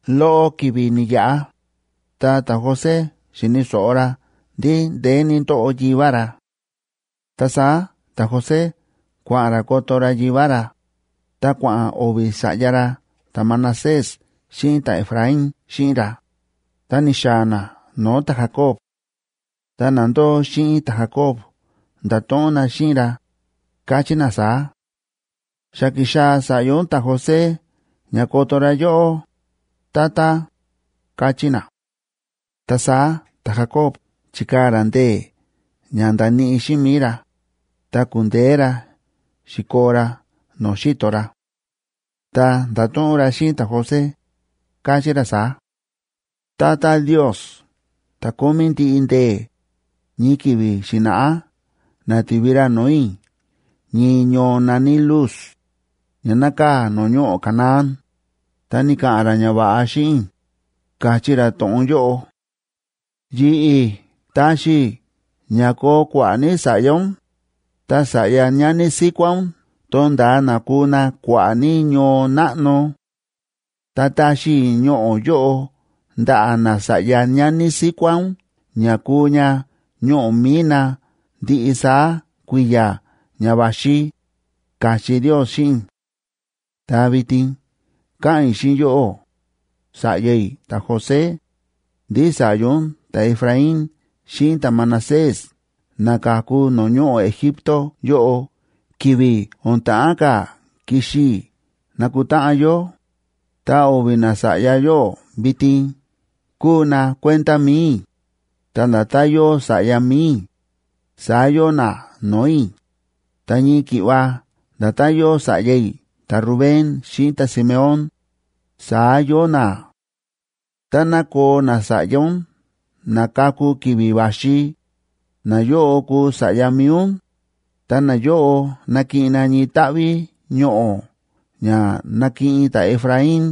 Loꞌo ki̱vi̱ ni̱yaꞌa, ta ta̱José xi̱ni̱ so̱ꞌo ra ndí ndeé ní ndóꞌo yivá ra. Ta saá ta̱José kua̱ꞌa̱n ra koto ra yivá ra, ta kua̱ꞌa̱n o̱vi̱ sa̱ꞌya ra ta̱Manasés xíꞌin ta̱Efraín xíꞌin ra, ta ni̱xaa̱ na no̱o̱ ta̱Jacob. Ta na ndóo xíꞌin ta̱Jacob nda̱to̱ꞌon na xíꞌin ra, káchí na saá: ―Xa ki̱xaa̱ sa̱ꞌya ún ta̱José ña koto ra yóꞌó, tata ―káchí na. Ta saá ta̱Jacoba chi̱kaa̱ ra ndee̱ ña ndaníꞌi xíꞌin mi̱i ra, ta ku̱ndeé ra xi̱koo ra no̱o̱ xi̱to ra. Ta nda̱to̱ꞌon ra xíꞌin ta̱José, káchí ra saá: ―Tata Ndios ta̱ Kómí Ndiꞌi Ndee̱, ñii ki̱vi̱ xi̱na̱ꞌá na̱ti̱vi ra no̱o̱ i̱ ñii ñoo na̱ní Luz, ña nákaa̱ no̱o̱ ñoꞌo̱ Canaán, ta ni̱ka̱ꞌa̱n ra ñava̱ꞌa xíꞌin i̱, ka̱chí ra to̱ꞌon yóꞌo: “Yi̱ꞌi̱ taxi i̱ ña koo kua̱ꞌa̱ ní sa̱ꞌya ún, ta sa̱ꞌya ñani síkuá ún to̱nda̱a na kuu na kua̱ꞌa̱ ní ñoo náꞌno. Ta taxi i̱ ñoꞌo̱ yóꞌo ndaꞌa̱ nasa̱ꞌya ñani síkuá ún ña kuu ña ñoꞌo̱ mi̱i na ndiꞌi saá kui̱ya̱ ña va̱xi”, ka̱chí Ndios xíꞌin i̱. Ta vitin káꞌa̱n i̱ xíꞌin yóꞌó, sa̱ꞌya i̱ ta̱José, ndí sa̱ꞌya ún ta̱Efraín xíꞌin ta̱Manasés na ka̱ku no̱o̱ ñoꞌo̱ Egipto yóꞌo ki̱vi̱ o̱n ta̱ꞌán ka̱ kixi i̱ nakutáꞌan yó, ta o̱vi̱ nasa̱ꞌya yóꞌo vitin kúu na kuenda mi̱i i̱, ta nda̱tán yóo sa̱ꞌya mi̱i i̱, saá yóo na no̱o̱ i̱, ta ñii ki̱ꞌva nda̱tán yóo sa̱ꞌya i̱ ta̱Rubén xíꞌin ta̱Simeón, saá yóo na. Táná koo nasa̱ꞌya ún na kaku ki̱vi̱ va̱xi, nayóꞌo kuu sa̱ꞌya mi̱i ún, ta nayóꞌo nakiꞌin na ñii táꞌví ñoꞌo̱ ña nakiꞌin ta̱Efraín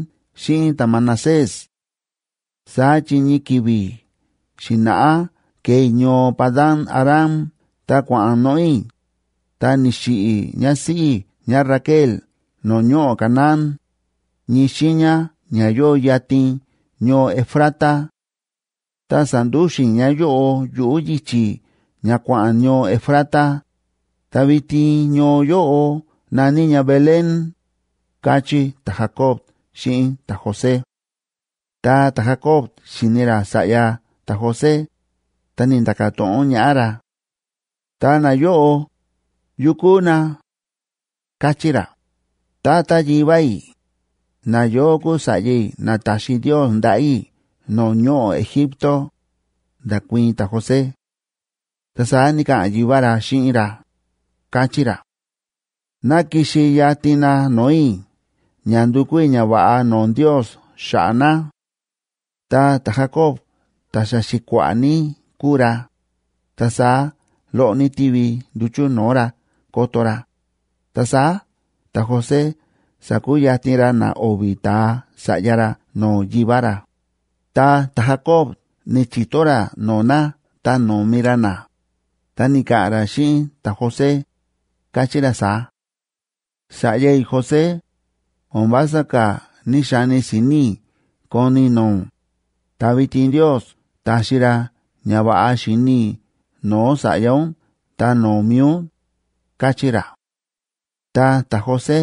xíꞌin ta̱Manasés. Saá chi ñii ki̱vi̱ xi̱na̱ꞌá ke̱e i̱ ñoo Padan‑aram ta kua̱ꞌa̱n noꞌo̱ i̱, ta ni̱xiꞌi̱ ñásíꞌí i̱ ñáRaquel no̱o̱ ñoꞌo̱ Canaán, ñii xiiña ña yóo yatin ñoo Efrata. Ta sa̱ndúxu̱n i̱ ñáyóꞌo yuꞌu̱ yichi̱ ña kua̱ꞌa̱n ñoo Efrata, ta vitin ñoo yóꞌo na̱ní ña Belén ―káchí ta̱Jacob xíꞌin ta̱José. Ta ta̱Jacob xi̱ni ra sa̱ꞌya ta̱José, ta ni̱nda̱ka̱ to̱ꞌon ñaꞌá ra: ―Ta nayóꞌo, ¿yu kúu na? ―káchí ra. ―Tata yivá i̱, nayóꞌo kúu sa̱ꞌya i̱ na ta̱xi Ndios ndaꞌa̱ i̱ no̱o̱ ñoꞌo̱ Egipto ―nda̱kuii̱n ta̱José. Ta saá ni̱ka̱ꞌa̱n yivá ra xíꞌin ra, káchí ra: ―Ná kixi yatin na no̱o̱ i̱ ña ndukú i̱ ñava̱ꞌa no̱o̱ Ndios xa̱ꞌa̱ na. Ta ta̱Jacob ta̱ xa xi̱kua̱ꞌa̱ ní kúu ra, ta saá loꞌo ní tívi nduchu̱ no̱o̱ ra koto ra, ta saá ta̱José sa̱kuyatin ra na o̱vi̱ ta̱a sa̱ꞌya ra no̱o̱ yivá ra, ta ta̱Jacob ni̱chi̱to ra no̱o̱ na ta no̱mi ra na. Ta ni̱ka̱ꞌa̱n ra xíꞌin ta̱José, káchí ra saá: ―Sa̱ꞌya i̱ José, o̱n vása ka̱ ní‑xani si̱ni̱ i̱ koni i̱ no̱o̱ ún, ta vitin Ndios ta̱xi ra ña va̱ꞌa xíni i̱ no̱o̱ sa̱ꞌya ún ta no̱o̱ mi̱i ún ―káchí ra. Ta ta̱José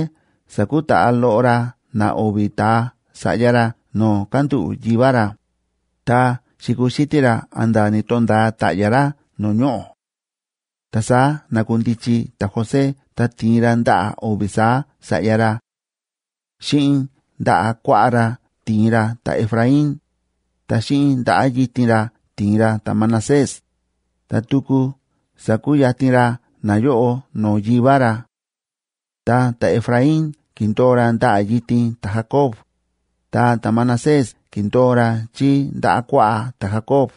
sa̱kutaꞌa loꞌo ra na o̱vi̱ ta̱a sa̱ꞌya ra no̱o̱ kándúꞌu̱ yivá ra, ta xi̱kuxítí ra a̱nda̱ ni̱to̱nda̱a ta̱ꞌya̱ ra no̱o̱ ñoꞌo̱. Ta saá na̱kundichi ta̱José ta ti̱in ra ndaꞌa̱ o̱vi̱ saá sa̱ꞌya ra; xíꞌin ndaꞌa̱ kuaꞌá ra ti̱in ra ta̱Efraín, ta xíꞌin ndaꞌa̱ yitin ra ti̱in ra ta̱Manasés, ta tuku sa̱kuyatin ra nayóꞌo no̱o̱ yivá ra. Ta ta̱Efraín ki̱ndo̱o ra ndaꞌa̱ yitin ta̱Jacob, ta ta̱Manasés ki̱ndo̱o ra chí ndaꞌa̱ kuaꞌá ta̱Jacob.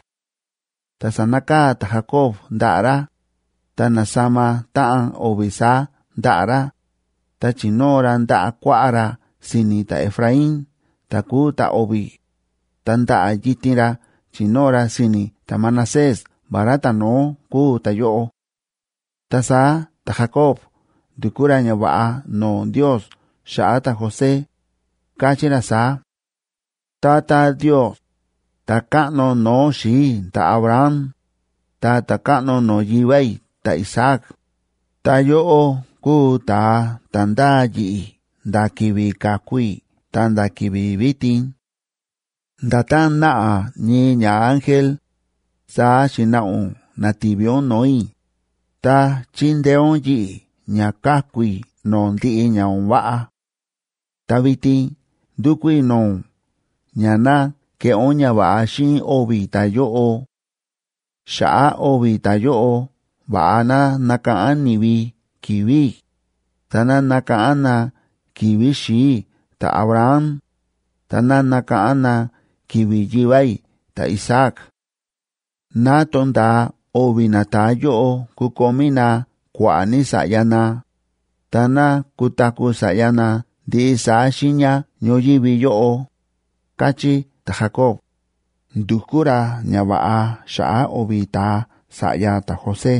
Ta sa̱nakaa̱ ta̱Jacob ndaꞌa̱ ra, ta na̱sama táꞌan o̱vi̱ saá ndaꞌa̱ ra, ta chi̱nóo ra ndaꞌa̱ kuaꞌá ra si̱ni̱ ta̱Efraín ta̱ kúu ta̱o̱vi̱, ta ndaꞌa̱ yitin ra chi̱nóo ra si̱ni̱ ta̱Manasés vará ta̱no̱ó kúu ta̱yóꞌo. Ta saá ta̱Jacob ndu̱kú ra ñava̱ꞌa no̱o̱ Ndios xa̱ꞌa̱ ta̱José, káchí ra saá: Tata Ndios, ta̱káꞌno no̱o̱ xi̱i̱ i̱ ta̱Abraham, ta ta̱káꞌno no̱o̱ yivá i̱ ta̱Isaac, ta yóꞌó kúu ta̱a ta̱ ndáa yi̱ꞌi̱ nda̱ ki̱vi̱ ka̱ku i̱ ta̱nda̱ ki̱vi̱ vitin. Nda̱tán náꞌa ñii ñaángel, saá xi̱naꞌa ún na̱ti̱vi ún no̱o̱ i̱, ta chíndeé ún yi̱ꞌi̱ ña káku i̱ no̱o̱ ndiꞌi ña o̱n váꞌa. Ta vitin ndúkú i̱ no̱o̱ ún ña ná keꞌé ún ñava̱ꞌa xíꞌin o̱vi̱ ta̱yóꞌo. Xa̱ꞌa̱ o̱vi̱ ta̱yóꞌo va̱ꞌa ná nakáꞌán ni̱vi ki̱vi̱ i̱, ta ná nakáꞌán na ki̱vi̱ xi̱i̱ i̱ ta̱Abraham, ta ná nakáꞌán na ki̱vi̱ yivá i̱ ta̱Isaac. Ná to̱nda̱a o̱vi̱ nata̱a yóꞌo kukomí na kua̱ꞌa̱ ní sa̱ꞌya na, ta ná kutaku̱ sa̱ꞌya na ndiꞌi saá xiiña ñoyívi yóꞌo, káchí ta̱Jacob, ndu̱kú ra ñava̱ꞌa xa̱ꞌa̱ o̱vi̱ ta̱a sa̱ꞌya ta̱José.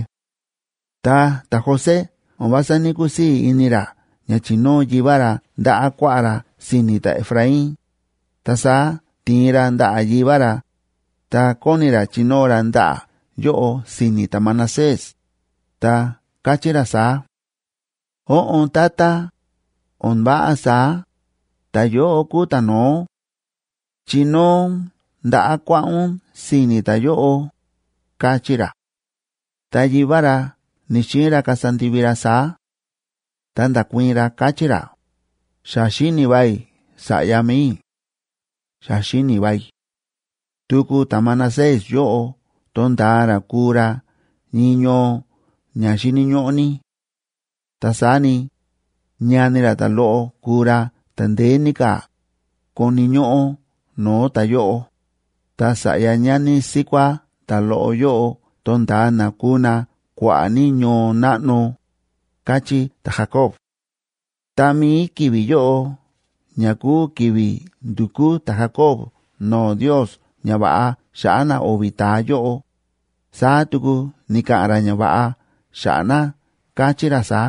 Ta ta̱José o̱n vása ní‑kusii̱ ini ra ña chi̱nóo yivá ra ndaꞌa̱ kuaꞌá ra si̱ni̱ ta̱Efraín, ta saá ti̱in ra ndaꞌa̱ yivá ra, ta kóni ra chinóo ra ndaꞌa̱ yóꞌo si̱ni̱ ta̱Manasés, ta káchí ra saá: ―Óꞌon, tata, o̱n váꞌa saá. Ta̱yóꞌo kúu ta̱no̱ó. Chinóo ún ndaꞌa̱ kuaꞌá ún si̱ni̱ ta̱yóꞌo ―káchí ra. Ta yivá ra ni̱‑xiin ra kasa ndivi ra saá, ta nda̱kuii̱n ra, káchí ra: ―Xa xíni̱ va i̱, sa̱ꞌya mi̱i i̱. Xa xíni̱ va i̱. Tuku ta̱Manasés yóꞌo to̱nda̱a ra kuu ra ñii ñoo ña xíni̱ ñóꞌó ní. Ta saá ni, ñani ra ta̱loꞌo kuu ra ta̱ ndeé ní ka̱ koni̱ ñóꞌó no̱o̱ ta̱yóꞌo, ta sa̱ꞌya ñani síkuá ta̱loꞌo yóꞌo to̱nda̱a na kuu na kua̱ꞌa̱ ní ñoo náꞌno ―káchí ta̱Jacob. Tá mií ki̱vi̱ yóꞌo ña kúu ki̱vi̱ ndu̱kú ta̱Jacob no̱o̱ Ndios ñava̱ꞌa xa̱ꞌa̱ na o̱vi̱ ta̱a yóꞌo, saá tuku ni̱ka̱ꞌa̱n ra ñava̱ꞌa xa̱ꞌa̱ na, káchí ra saá: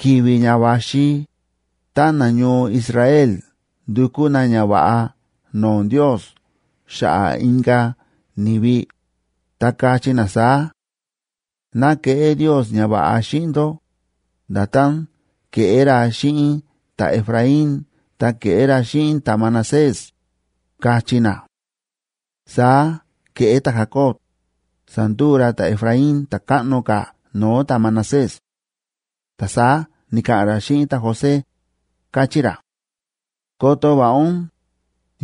Ki̱vi̱ ña va̱xi tá nañoo Israel ndukú na ñava̱ꞌa no̱o̱ Ndios xa̱ꞌa̱ inka̱ ni̱vi, ta kachí na saá: “Ná keꞌé Ndios ñava̱ꞌa xíꞌin ndó, nda̱tán ke̱ꞌé ra xíꞌin ta̱Efraín ta ke̱ꞌé ra xíꞌin ta̱Manasés”, kachí na. Saá ke̱ꞌé ta̱Jacob, sa̱nduu ra ta̱Efraín ta̱ káꞌno ka̱ no̱o̱ ta̱Manasés. Ta saá ni̱ka̱ꞌa̱n ra xíꞌin ta̱José, káchí ra: ―Koto va̱ꞌa ún,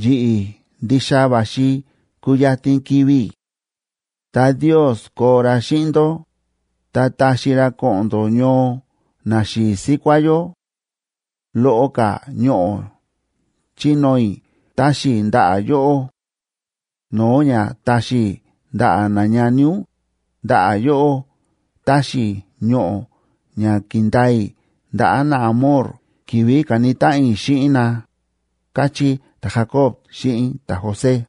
yi̱ꞌi̱ ndixa va̱xi kuyatin kivi̱ i̱; ta Ndios koo ra xíꞌin ndó, ta taxi ra ko̱ꞌo̱n ndó ñoo naxi̱i̱ síkuá yó. Loꞌo ka̱ ñoꞌo̱ chínóo i̱ táxi i̱ ndaꞌa̱ yóꞌó no̱o̱ ña taxi i̱ ndaꞌa̱ nañani ún; ndaꞌa̱ yóꞌó táxi i̱ ñoꞌo̱ ña ki̱ndaa i̱ ndaꞌa̱ naAmor ki̱vi̱ ka̱ni táꞌan i̱ xíꞌin na ―káchí ta̱Jacob xíꞌin ta̱José.